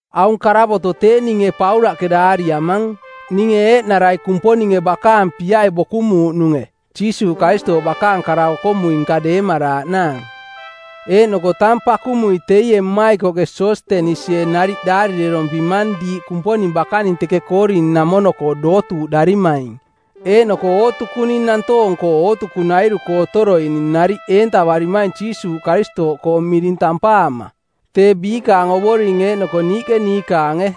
Aung karavoto˜ tee ninge Paulaꞌke daariamang, ninge eeꞌnarai Kumponinge bakaang piai bokumuuꞌnunge Jiisuuꞌ Karistooꞌ bakaang kara-okomui-nka deemaraaꞌnaang. Eeꞌnoko tang pakumui teie mmaikoꞌke Sostenisie nariꞌ daarirerompimang diiꞌ Kumponing bakaning teke Koorin-namono-koo dootuuꞌdarimaing, eeꞌnoko ootukuning nantoong-koo ootukunairu-koo otoroining nariꞌ eentavarimaing Jiisuuꞌ Karistooꞌkoo miring tampaama, tee biikaang Ovoring eeꞌnoko niiꞌke niikaange.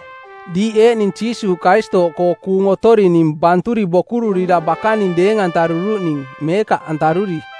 Diiꞌ eeꞌning Jiisuuꞌ Karistooꞌkoo kuung otorining banturi bokururira bakaning deeng-antaruruꞌning meekaꞌantaruri.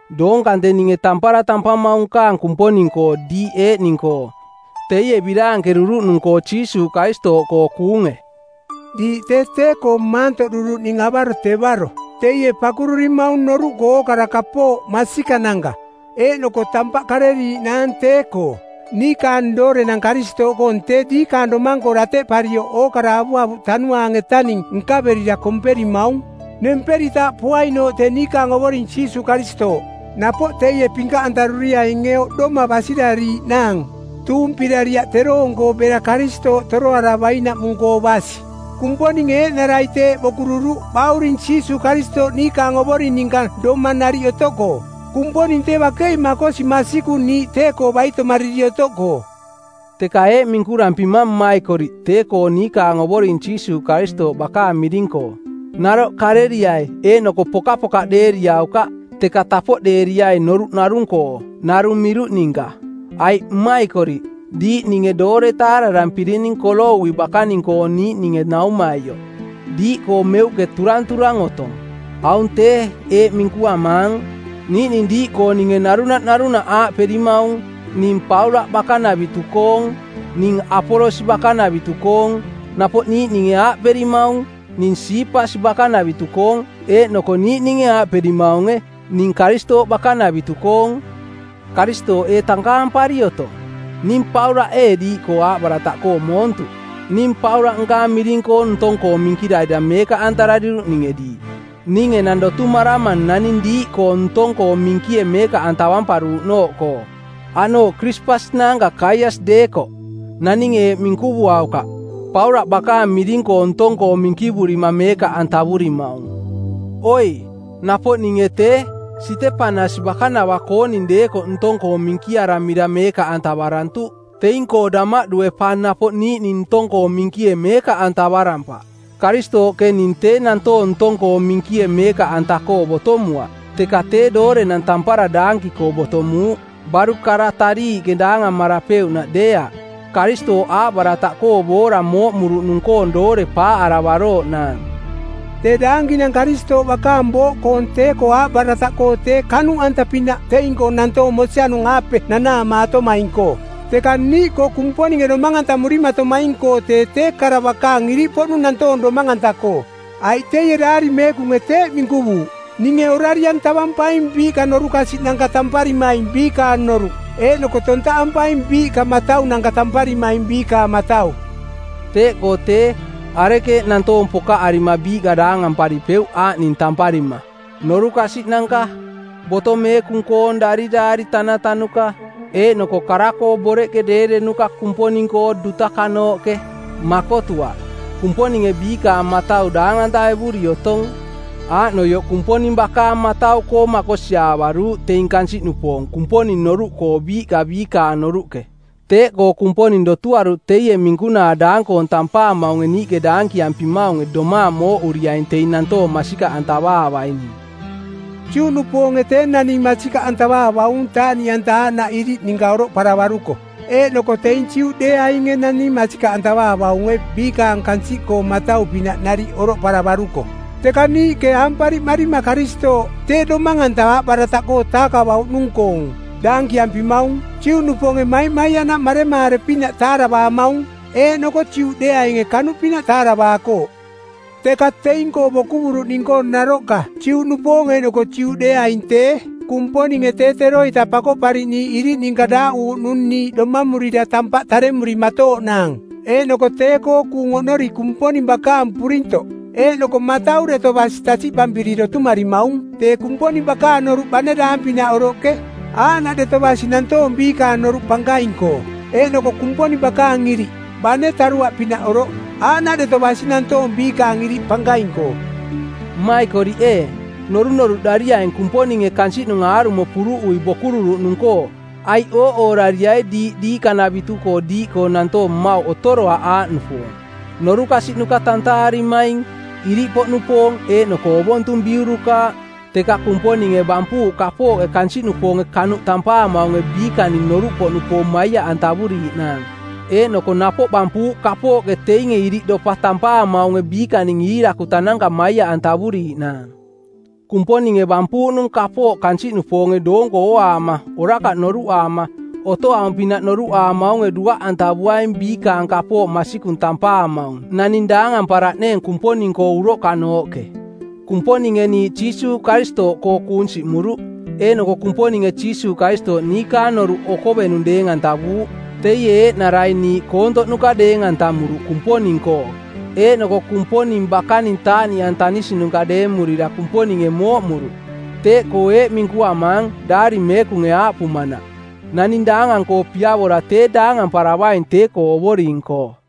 Doong kante ninge tampara tampamaung nkaang Kumponing-koo diiꞌ eeꞌning-koo, teie biraankeruruꞌnung-koo Jiisuuꞌ Karistooꞌkoo kuunge. Diiꞌ tee tee-koo maantoꞌduruꞌning avaro-tevaro. Teie pakururimaung noruꞌkoo ookara kapooꞌ masikananka eeꞌnoko tampaꞌ kareriaꞌnaang tee-koo. Niikaang doorenang Karistooꞌkoong tee diikaang domang-koo dateꞌparioꞌ ookara avuavuꞌ tanuaang-etaning nkaverira komperimaung nemperitaaꞌ poainooꞌ tee niikaang Ovoring Jiisuuꞌ Karistooꞌ. Napoꞌ teie pinkaꞌantaruriainge oꞌdoma basirariiꞌnaang tuumpirariaꞌ teroong-koo bera Karistooꞌ toroaravainaꞌmung-koo basi. Kumponinge eeꞌnarai teeꞌ bokururuꞌ Bauring Jiisuuꞌ Karistooꞌ niikaang Ovoring ninka domang nariꞌ otoꞌkoo. Kumponing tee bakei makosi masikung niiꞌ tee-koo baitomariri otoꞌkoo. Teka eeꞌ minkurampimang mmaikoriꞌ tee-koo niikaang Ovoring Jiisuuꞌ Karistooꞌ bakaang miring-koo: Naroꞌ kareriai, eeꞌnoko pokapokaꞌdeeriaukaꞌ, teka tapoꞌdeeriai noruꞌ narung-koo, narung miruꞌ ninka. Aiꞌ, mmaikoriꞌ, diiꞌ ninge doore taararampirining Koloui bakaning-koo niiꞌninge naumaioꞌ, diiꞌkoo meuꞌke turanturang otong. Aung tee eeꞌ minkuamaang: Niiꞌning diiꞌkooninge narunaꞌ narunaꞌ aaꞌperimaung, “Ning Paulaꞌ bakanavitu-koong.” “Ning Apolos bakanavitu-koong.” Napoꞌ niiꞌninge aaꞌperimaung, “Ning Siipas bakanavitu-koong.” Eeꞌnoko niiꞌninge aaꞌperimaunge, “Ning Karistooꞌ bakanavitu-koong.” Karistooꞌ ee tankaampari otong? Ning Paulaꞌ ee diiꞌkoo aaꞌbarataꞌkoo moontuꞌ? Ning Paulaꞌ nkaang miring-koo ntong-koo minkirarira meekaꞌantarariruꞌninge diiꞌ? Ning enang dotumaramang naning diiꞌkoong ntong-koo minkie meekaꞌantavamparuuꞌnooꞌkoo, aꞌnooꞌ Krispas naanka Gaias deekoꞌ. Naninge eeꞌ minkuvuaukaꞌ, “Paulaꞌ bakaang miring-koo ntong-koo minkivurima meekaꞌantavurimaung.” Oi, napoꞌ ninge tee, Sitepanas bakanava-kooning deekoꞌ ntong-koo minkiaramira meekaꞌantavarantuꞌ. Teing-koo damaꞌdue pa napoꞌ niiꞌning ntong-koo minkie meekaꞌ antavarampaꞌ. Karistooꞌke ning tee nantoong ntong-koo minkie meekaꞌanta-koo botomuaꞌ, teka tee doorenang tampara daanki-koo botomuuꞌ, baruꞌ kara tariiꞌke daangamarapeuꞌnaꞌ deeaꞌ, Karistooꞌ aaꞌbarataꞌkoo boora mooꞌmuruꞌnung-koong doore paaꞌaravarooꞌnaang. Tee daankinang Karistooꞌ bakaang booꞌkoong tee-koo aaꞌbarataꞌkoo tee kanuꞌanta-pinaꞌ teing-koo nantoong mosianung-aape nanaamaatomaing-koo. Teka niiꞌkoo, Kumponinge domang-antamurimatomaing-koo tee tee kara bakaang iriꞌpoꞌnung nantoong domang-anta-koo. Aiꞌ teie Daari Meekunge teeꞌ minkuvuuꞌ, “Ninge orari-antavampaing biiꞌka norukasiꞌnanka tamparimaing biikaang noruꞌ, eeꞌnoko tontaꞌampaing biiꞌka mataunanka tamparimaing biikaang matau.” Teeꞌkoo tee, arekeeꞌ nantoong pokaꞌarima biiꞌka daangamparipeuꞌ aaꞌning tamparima: norukasiꞌnanka, Boto Meekung-koong Dariraari tanatanuka, eeꞌnoko kara-koo boreꞌke deerenuka Kumponing-koo dutakanooꞌke? Makotuaꞌ. Kumponinge biikaang matau daang-antaevuri otong. Aaꞌnoioꞌ Kumponing bakaang matau-koo makosiaavaruuꞌ teing kansiꞌnupoong Kumponing noruꞌkoo biiꞌka biikaang noruꞌke. Teeꞌkoo Kumponing dotuaruꞌ teie minkunaa daang-koong tampaamaunge niiꞌke daankiampimaunge domaang mooꞌuriaing teing nantoong masikaꞌantavaavaining. Juꞌnupoonge tee naning masikaꞌantavaavaung taaꞌniꞌanta aaꞌnaꞌ iriꞌ ninka oroꞌparavaruko, eeꞌnoko teing Juꞌdeeainge naning masikaꞌantavaavaunge biikaang kansiꞌkoong matau-pinaꞌ nariꞌ oroꞌparavaruko. Teka niiꞌke aampariꞌmarima Karistooꞌ, tee Domang-anta aaꞌbarataꞌkoo˜ taakavauꞌnung-koong, daankiampimaung, Juꞌnupoonge maimaiaꞌnaꞌ maremaare-pinaꞌ taaravaamaung, eeꞌnoko Juꞌdeeainge kanuꞌpinaꞌ taaravaakooꞌ. Teka teing-koo bokuvuruꞌning-koo naroꞌka, Juꞌnupoong eeꞌnoko Juꞌdeeaing tee, Kumponinge tee teroita Pakoꞌpariꞌniiꞌ iriꞌ ninka daaꞌuuꞌnung niiꞌ domamurira tampaꞌ taremurimatooꞌnaang, eeꞌnoko tee-koo kuung oꞌnori Kumponing bakaang purintoꞌ eeꞌnoko matau deto basi tasiꞌpampiri dotumarimaung. Tee Kumponing bakaang noruꞌ bane daang-pinaꞌ oroꞌke, aaꞌnaꞌ deto basi nantoong biikaang noruꞌ pankaing-koo, eeꞌnoko Kumponing bakaang iriꞌ, bane taruaꞌpinaꞌ oroꞌ, aaꞌnaꞌ deto basi nantoong biikaang iriꞌ pankaing-koo. Mmaikoriꞌ ee, norunoruꞌdariaing Kumponinge kansiꞌnung aarumo puruꞌui bokururuꞌnung-koo, aiꞌ ooꞌoorariai diiꞌka diikanavitu diiꞌkoo nantoong mmauꞌ otoroaꞌ aaꞌnupoong: norukasiꞌnuka tantaarimaing, iriꞌpoꞌnupoong eeꞌnoko ovontung biurukaaꞌ. Teka Kumponinge bampuuꞌ kapooꞌke kansiꞌnupoonge kanuꞌ tampaamaunge biikaning noruꞌpoꞌnupoong maiaꞌantavuriiꞌnaang, eeꞌnoko napoꞌ bampuuꞌ kapooꞌke teinge iriꞌdopa tampaamaunge biikaning iirakutananka maiaꞌantavuriiꞌnaang. Kumponinge bampuuꞌnung kapooꞌ kansiꞌnupoonge doonko ooaama, orakaꞌ noruꞌaama, otoaung-pinaꞌ noruꞌaamaunge duaꞌantavuaing biikaang kapooꞌ masikung tampaamaung, naning daangamparaꞌneeng Kumponing-koo uroꞌka-nooꞌke. Kumponinge niiꞌ Jiisuuꞌ Karistooꞌkoo kuung siꞌmuruꞌ, eeꞌnoko Kumponinge Jiisuuꞌ Karistooꞌ niikaang noruꞌ okovenung deeng-antavuuꞌ. Teie eeꞌnarai niiꞌ koontoꞌnuka deeng-antamuruꞌ Kumponing-koo eeꞌnoko Kumponing bakaning taaꞌniꞌantanisinuka deemurira Kumponinge mooꞌmuruꞌ. Teeꞌkoo eeꞌ minkuamaang, Daari Meekunge aaꞌpumanaꞌ, “Naning daangang-koo piavora tee daangamparavaing tee-koo Ovoring-koo.”